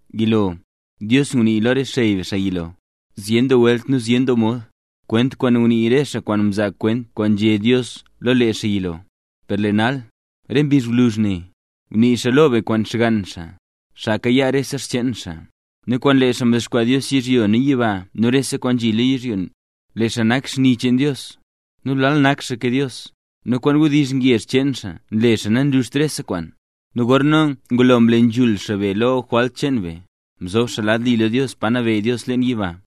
Yilo, Dios ngunii lo re xey be xaa yilo, zyen doo welt nu zyen doo mod, kwent kwaan ngunii re xaa kwaan mzaa kwent kwaan nzhé Dios lo lee xaa yilo; per lee nal, re mbizh gwluzh ne, ngunii xaa lo be kwaan Xgann xaa, xaa kayaa rese xcheen xaa, nu kwaan lee xaa mdexkwaa Dios yizhyo nu yiba nu rese kwaan nzhi lo yizhyo. Lee xaa nak xni cheen Dios, nu lal nak xaa ke Dios, nu kwaan wdizh ngezh cheen xaa nle zee nanluxt rese kwaan. Nu gorna ngulo mle nzhul xaa be lo re jwalt cheen be, mzob xaa lad li lo Dios, Pa Nabeyy Dios leen yiba.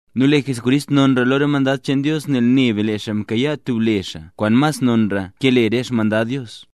Nu lee Jesucrist nonra lo re mandad cheen Dios, nel ne be lee xaa mkayaa tub le xaa kwaan mas non ke le re xmandad Dios.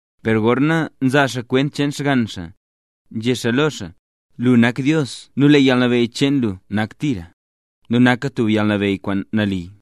Per gorna nzaa xaa kwent cheen Xgann xaa, nzhé xaa lo xaa: Lu nak Dios nu lee yalnabeyy cheen lu nak tira, nu naka tub yalnabeyy kwaan nali.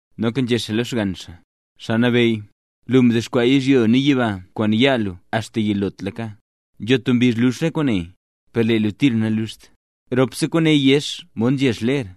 Noka nzhé xaa lo Xgann xaa: Xaa Nabeyy, lu mdexkwaa yizhyo nu yiba kwaan yaa lu axta yilotlaka. Nzho tub mbizh lux rop kwaane, per lee lu tira naluxt. Ropse kwaane yex mod nzhex ler;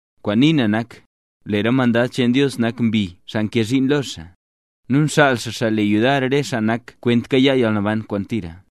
Kwaan nii na nak: Lee re mandad cheen Dios nak mbi, xaa nkee zhiin lo xaa, nu nxaal xaa xaa nle yudar re xaa nak kwent kayaa yalnaban kwaan tira.